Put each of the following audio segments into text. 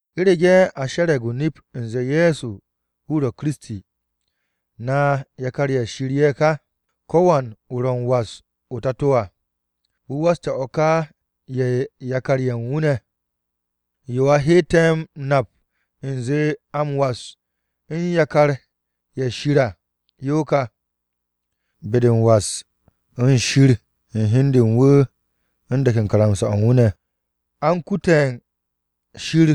U̱rege̱ a she̱re̱g o-nip u̱nze Ye̱so wu̱ ro̱ Kiristi, na yakar-ye̱ Shir ye̱ ka. Ko̱wan wu̱ ro̱ m-was o-Tato à, wu̱ waste̱ o̱ ká u̱n yakar-ye̱ u̱n wu̱ ne̱. Yo a hette̱ m-nap u̱nze a m-was u̱n yakar-ye̱ Shir à yo kà: Be-de u̱n was u̱n Shir u̱n hi u̱n de u̱n wu̱ u̱n de̱k u̱n karamsa-o̱ u̱n wu̱ ne̱. A u̱n kute̱ u̱n Shir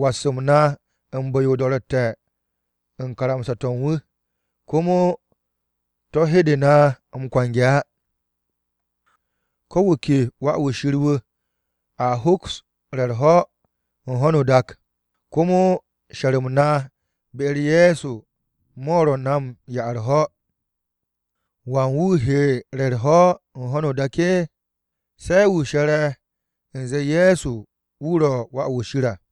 was-m na u̱n bu̱-yo o-do̱ro̱tte̱ u̱n karamsa-to̱ u̱n wu̱, komo to̱ hede na m-kwange̱ á. Ko wu̱ ke wà-wu̱ Shir wu̱, a hoks re̱ u̱r-ho̱ u̱n ho̱no o-dak, komo she̱r-m na be-u̱r Ye̱so mo̱ ro̱ na m-'ya u̱r-ho̱. ¿Wan wu̱ he re̱ u̱r-ho̱ u̱n ho̱no o-dak á? Se̱ wu̱ she̱re̱ u̱nze Ye̱so wu̱ ro̱ Wà-wu̱ Shir à.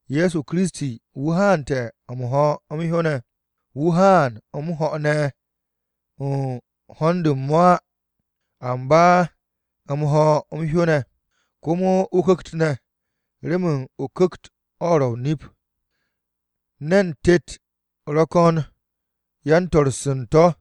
Ye̱so Kiristi, wu̱ haane̱ m-ho̱ m-hyó ne̱. Wu̱ haan m-ho̱ ne̱ u̱n hond u̱n mo̱ á, amba m-ho̱ m-hyó ne̱. Komo o-Ku̱kt ne̱, remen o-Ku̱kt o̱ ro̱ o-nip. Ne̱n tet ro̱ ko̱n yan-to̱r-se u̱n to̱.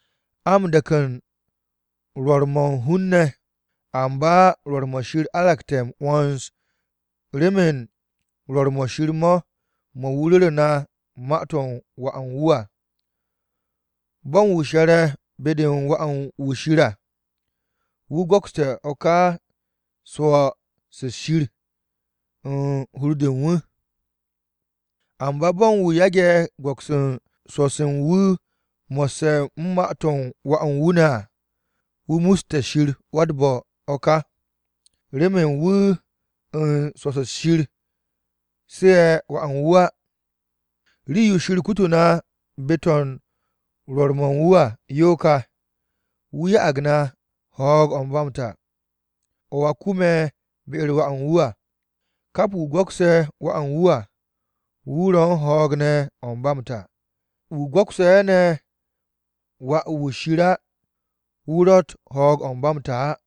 A m-de̱k u̱n rwo̱r-mo̱ u̱n hun-ne̱, amba rwo̱r-mo̱ Shir aragte̱ m-'wo̱ns remen rwo̱r-mo̱ Shir mo̱, mo̱ wu̱ ru̱ru̱ na ma-to̱ u̱n Wà u̱n wu̱ à. Bo̱ u̱n wu̱ she̱re̱ be-de u̱n Wà-wu̱ Shir à, wu̱ go̱kste̱ o̱ ka swo̱-se Shir u̱n hur-de u̱n wu̱. Amba bo̱ u̱n wu̱ yage̱ go̱ks swo̱-se u̱n wu̱ mo̱sse̱ u̱n ma-to̱ u̱n Wà u̱n wu̱ ne̱ á, wu̱ musste̱ Shir wa-u̱t-bo̱ o̱ ka. Remen wu̱ u̱n swo̱-se Shir su̱'e̱ Wà u̱n wu̱ á. Rii-yo Shir kutu̱ na be-to̱ u̱n rwo̱r-mo̱ u̱n wu̱ à, yo ka, wu̱ ya'ag na ho̱o̱g-o̱ ba m-ta, o̱ a kume̱ be-u̱r Wà u̱n wu̱ à. Kap wu̱ go̱kse̱ Wà u̱n wu̱ à, wu̱ ro̱ u̱n ho̱o̱g ne̱ o̱ ba m-ta. Wu̱ go̱kse̱ ne̱ Wà u̱n Shir á, wu̱ ro̱tt ho̱o̱g-o̱ ba m-ta á.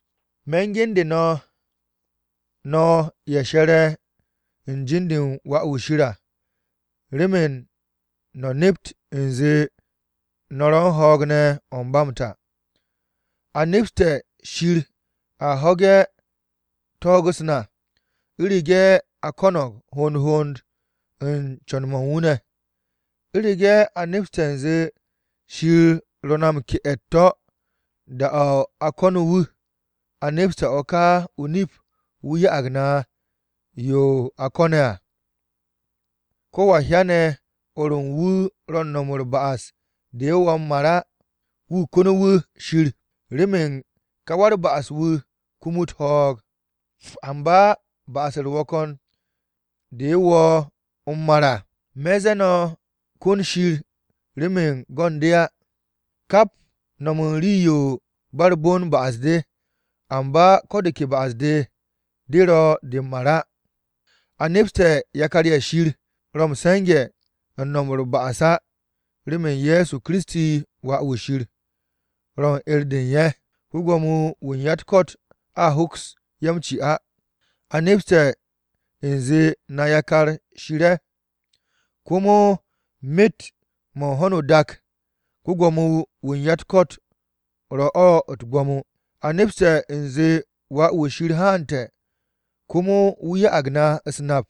Me̱ u̱n gende̱ no̱, no̱ ye̱ she̱re̱ u̱n jin-de u̱n Wà-wu̱ Shir à, remen no̱ nept u̱nze no̱ ro̱ u̱n ho̱o̱g ne̱ o̱ ba m-ta. A nepste̱ Shir a ho̱ge̱ ko̱n-u̱s na, u̱rege̱ a ko̱no̱g hond hond u̱n co̱n-mo̱ u̱n wu̱ ne̱. U̱rege̱ a nepse̱ u̱nze Shir ro̱ na m-ke'e̱ u̱t-to̱ da-o̱ a ko̱nu̱ wu̱, a nepste̱ o̱ ka o-nip wu̱ ya'ag na yo a ko̱ne̱ à. Kowa hyane̱ o̱r u̱n wu̱ ro̱ u̱n no̱m u̱r-ba'as de wo̱ m-mar á, wu̱ ko̱nu̱ wu̱ Shir. Remen ka wa-u̱r-ba'as-wu̱ kumut ho̱o̱g. Amba ba'as-u̱r ro̱ ko̱n de wo̱o̱ m-mar à, me̱ ze̱ no̱ ko̱n Shir remen go̱ u̱n de á. Kap no̱m u̱n rii-yo ba u̱r-bon ba'as-de. Amba ko̱ de ke ba'as-de ro̱ de m-mar á. A nepste̱ yakar-ye̱ Shir ro̱ m-se̱nge̱ m-no̱m u̱r-ba'as á, remen Ye̱so Kiristi, Wà-wu̱ Shir, ro̱ u̱n 'er-de u̱n ye̱, ko-Gwo̱mo-wu̱ u̱n ya-u̱t-ko̱t a hoks ye̱ m-ci á. A nepse̱ u̱nze na yakar-ye̱ Shir ye̱, komo myet-mo̱ u̱n ho̱no o-dak, ko-Gwo̱mo-wu̱ u̱n ya-u̱t-ko̱t ro̱ o̱ u̱t-gwo̱mo. A nepse̱ u̱nze Wà-wu̱ Shir haante̱, komo wu̱ ya'ag na u̱s-nap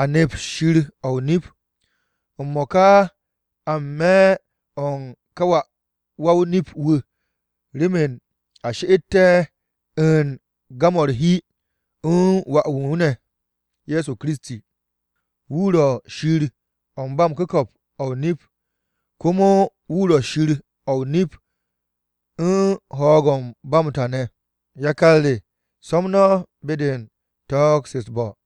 a nept Shir-o̱ o-nip. M-mo̱ka a n-me̱ u̱n ká wa-o-nip-wu̱ remen a she'ette̱ u̱n gam-o̱ u̱r-hi u̱n Wà u̱n wu̱ ne̱, Ye̱so Kiristi. Wu̱ ro̱ Shir-o̱ ba m-ku̱ko̱p o̱ o-nip, komo wu̱ ro̱ Shir-o̱ o-nip u̱n ho̱o̱g-o̱ ba m-ta ne̱. Yakar re, so̱m no̱ be-de u̱n gir-mo̱ u̱t-bo̱.